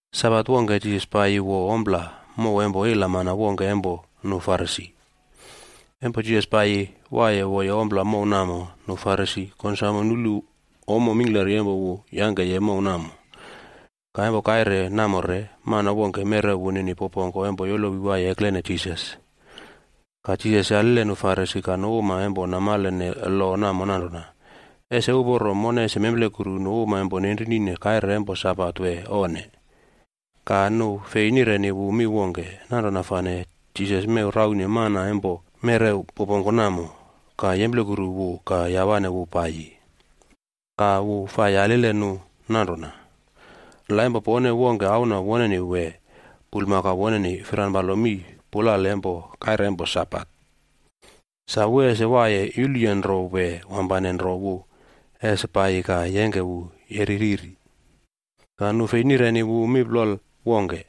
Sabat wongke, Jisas paiyi wo ompla mow empo ilamana wongke empo nu Farisi. Empo Jisas paiyi waiye woye ompla mow namo, nu Farisi konsamo nulu ommo mingklari empo wu yangkeye mow namo. Ka empo kaire namo re, mana wongke merew wunini popongko empo yolowi waiye eklene Jisas. Ka Jisas yalile nu Farisi ka nu uma empo namalene lo namo nanrona, “Ese uporo mone ese memplekuru nu uma empo nenrinine kaire empo Sabat wee onne?” Ka nu fei nireni wu mi wongke. Nanrona fane Jisas mew raune mana empo merew popongko namo, ka yemplekuru wu ka yawane wu paiyi. Ka wu fai yalile nu nanrona, “La empo pone wongke auna woneni wee, bulmakau woneni firanpalo mii pulale empo kaire empo Sabat, sa wu ese waiye yuluye nro wee wampane nro wu ese paiyi ka yengke wu yeri riri?” Ka nu fei nireni wu mi plol wongke.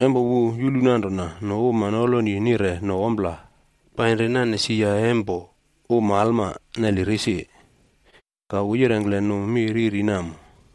Empo wu yulu nanrona nu uma noloni nire no ompla painri naine sia empo nu uma alma neli risi, ka wu yirengkle nu mi riri namo: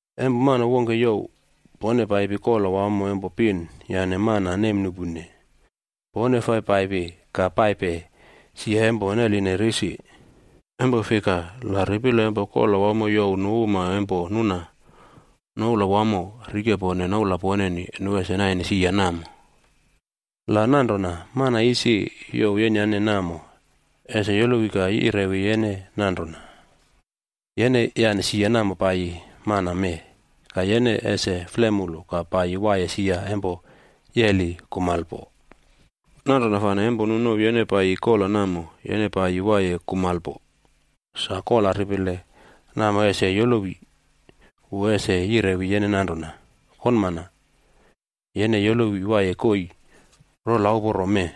“Empo mana wongke youw pone paipi kola wamo empo pin yane mana nemnuꞌpune, pone fai paipi ka paipe sia empo neline risi. Empo fika, la ripile empo kola wamo youw nu uma empo nuna noula wamo rikepone noula poneni, nu ese naine sia namo. La nanrona, mana isi youw yenyane namo ese yolowi ka yirewi yene nanrona, ‘Yene yane sia namo paiyi mana mee.’ Ka yene ese flemulu ka paiyi waiye sia empo yeli kumalpo. Nanrona fane empo nu nouw yene paiyi kola namo, yene paiyi waiye kumalpo, sa kola ripile namo ese yolowi, wu ese yirewi yene nanrona, ‘Konmana, yene yolowi waiye koii rola uporo mee.’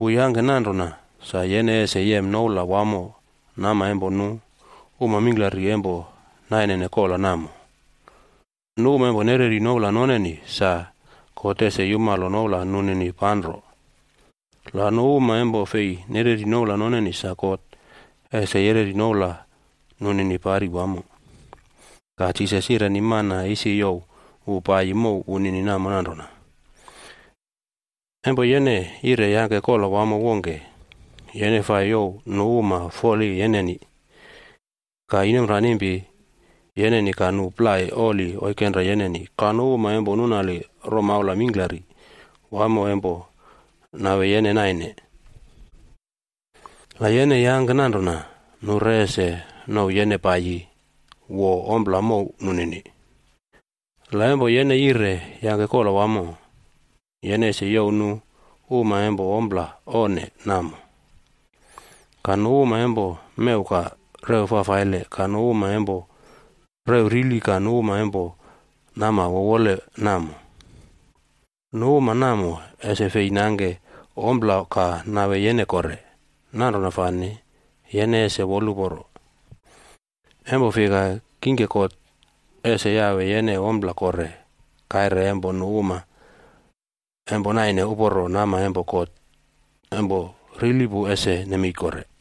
Wu yangke nanrona sa yene ese yem noula wamo nama empo nu uma mingklari empo nainene kola namo. Nu uma empo nereri noula noneni sa God ese yumalo noula nunini panro. La nu uma empo fei nereri noula noneni sa God ese yereri noula nunini pari wamo.” Ka Jisas yireni mana isi youw wu paiyi mow wunini namo nanrona, “Empo yene yire yangke kola wamo wongke, yene fai youw nu uma foli yeneni, ka inomranimpi yeneni ka nu plai oli oikenra yeneni ka nu uma empo nunali romaula mingklari wamo empo nawe yene naine. La yene yangke nanrona, nu re ese nouw yene paiyi wo ompla mow nunini. La empo yene yire yangke kola wamo, yene ese youw nu uma empo ompla onne namo, ka nu uma empo mew ka rew fafaile ka nu uma empo rew rili ka nu uma empo nama wowole namo. Nu uma namo ese fei nangke ompla ka nawe yene kore. Nanrona fane yene ese woluporo, empo fika kingke God ese yawe yene ompla kore taim nu uma uporo isi rili ese nemei kore.”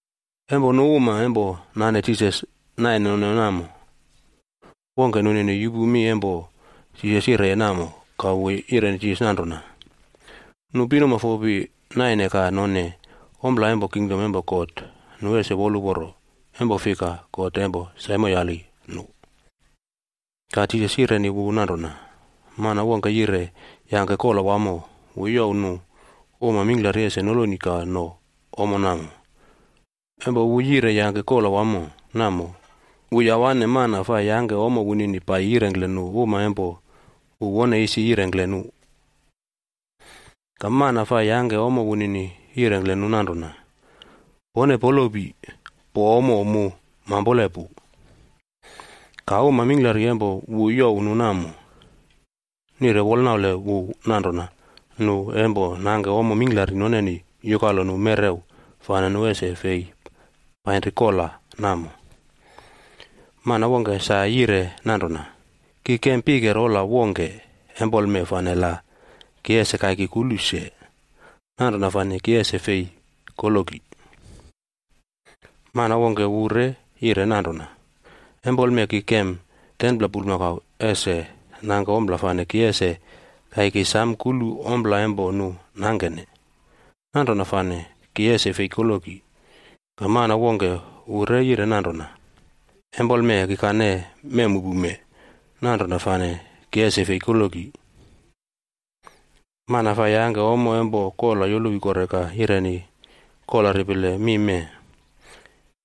Empo nu uma empo nane Jisas naine none namo wongke nunini yupu mi empo Jisas yireye namo, ka wu yireni Jisas nanrona, “Nu pinuma fopi naine ka none ompla empo kingdom empo God, nu ese woluporo, empo fika, God empo saimoyali nu.” Ka Jisas yireni wu nanrona, “Mana wongke yire yangke kola wamo, wu youw nu uma mingklari ese noloni ka no ommo namo. Empo wu yire yangke kola wamo namo, wu yawane mana fai yangke ommo wunini paiyi yirengkle nu uma empo wu wone isi yirengkle nu. Ka mana fai yangke ommo wunini yirengkle nu nanrona, ‘Pone polopi, po ommo mu mampole pu.’ “Ka uma mingklari empo wu youw nu namo, nire wolnaule wu nanrona nu empo nangke ommo mingklari noneni yukalo nu merew fane nu ese fei painri kola namo. Mana wongke sa yire nanrona, ‘Ki kem pike rola wongke empoleme fane la ki ese kaiki kulu se. Nanrona fane ki ese fei koloki.’ “Mana wongke wu re yire nanrona, ‘Empoleme ki kem 10pla bulmakau ese nangke ompla fane ki ese kaiki sam kulu ompla empo nu nangkene. Nanrona fane ki ese fei koloki.’ “Ka mana wongke wu re yire nanrona, ‘Empoleme kikane memmuꞌpume, nanrona fane ki ese fei koloki.’ “Mana fai yangke ommo empo kola yolowi kore ka yireni kola ripile mi mee.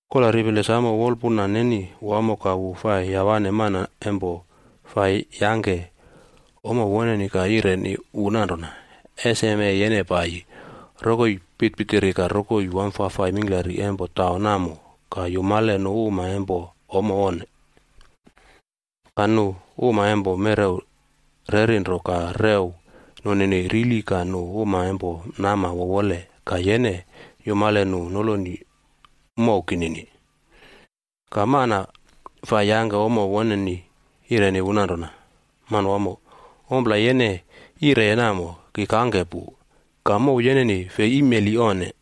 Kola ripile samo wolpuna neni wamo ka wu fai yawane mana empo fai yangke ommo woneni ka yireni wu nanrona, ‘Eseme yene paiyi, rokoi pitpitiri ka rokoi wamfafai mingklari empo taun namo ka yumale nu uma empo ommo onne, ka nu uma empo merew rerinro ka rew nunini rili ka nu uma empo nama wowole ka yene yumale nu noloni mow kinini.’ “Ka mana fai yangke ommo woneni yireni wu nanrona, ‘Manwamo, ompla yene yireye namo, ki kangke pu, ka mow yeneni fei imeli onne.’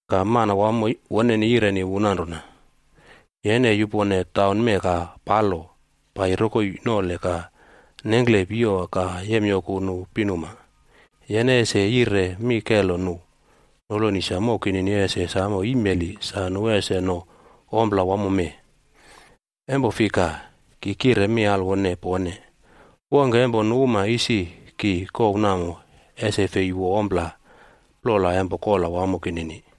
“Ka manawamo woneni yireni mana fai yangkeye ommo nanrona, ‘Yene yupone taun mee ka palo paiyi rokoi nole ka nengkle piyowa ka yemyoku nu pinuma, yene ese yire mi kelo nu noloni sa mow kinini ese samo imeli sa nu ese no ompla wamo mee. Empo fika ki kire mi alwone pone, wongke empo nu uma isi ki kouw namo, ese fei wo ompla plola empo kola wamo kinini.’”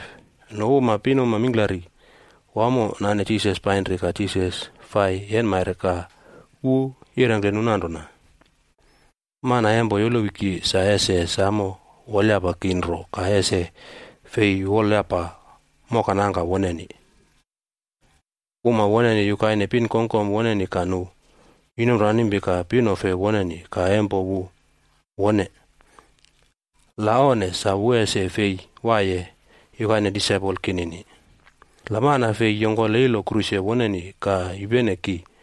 Nu uma pinuma mingklari wamo nane Jisas painri ka Jisas fai yenmaire ka wu yirengkle nu nanrona: “Mana empo yolowi ki sa ese samo wolyapa ki nro ka ese fei wolyapa moka nangka woneni, uma woneni yukaine pinkongkom woneni ka nu inomranimpi ka pinofe woneni ka empo laip woneni. La onne, sa wu ese fei waiye yukaine disaipol kinini. La mana fei yongkole ilo kruse woneni ka yupene ki,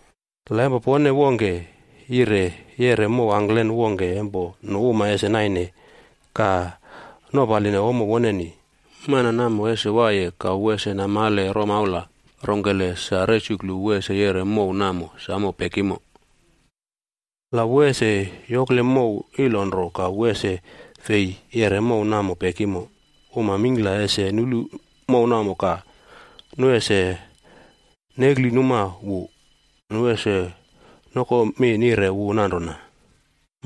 “La empo pone wongke yire yeꞌre mow angklen wongke empo nu uma ese naine ka nopaline ommo woneni, mana namo ese waiye ka wu ese namale romaula rongkele sa resuklu wu ese yeꞌre mow namo samo pekimo. La wu ese yokle mow ilo nro ka wu ese fei yeꞌre mow namo pekimo, uma mingkla ese nulu mow namo ka nu ese neklinuma wu. Nu ese nokomi nire wu nanrona,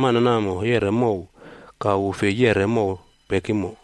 ‘Mana namo yeꞌre mow, ka wu fei yeꞌre mow pekimo.’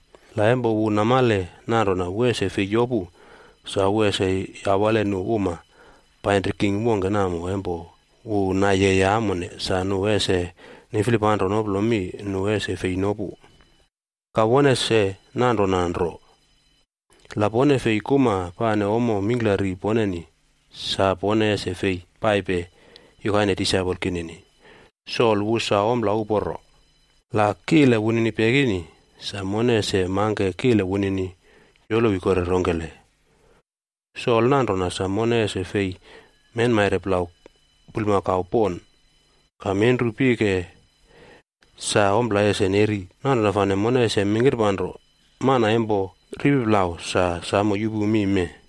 La empo wu namale nanrona wu ese fei yopu, sa wu ese yawale nu uma painri king wongke namo empo wu nayeye amone sa nu ese niflipanro noplo mi nu ese fei nopu. Ka won ese nanrona nro, la pone fei kuma pane ommo mingklari poneni, sa pone ese fei paipe yukaine disaipol kinini. “Sol wu sa ompla uporo, la kile wunini pekini, sa mone ese mangke kile wunini yolowi kore rongkele? Solc nanrona sa mone ese fei menmaire plau bulmakau pon ka menru pike sa ompla ese neri, nanrona fane mone ese mingkirpanro. “Mana empo ripi plau sa samo yupu mi mee.”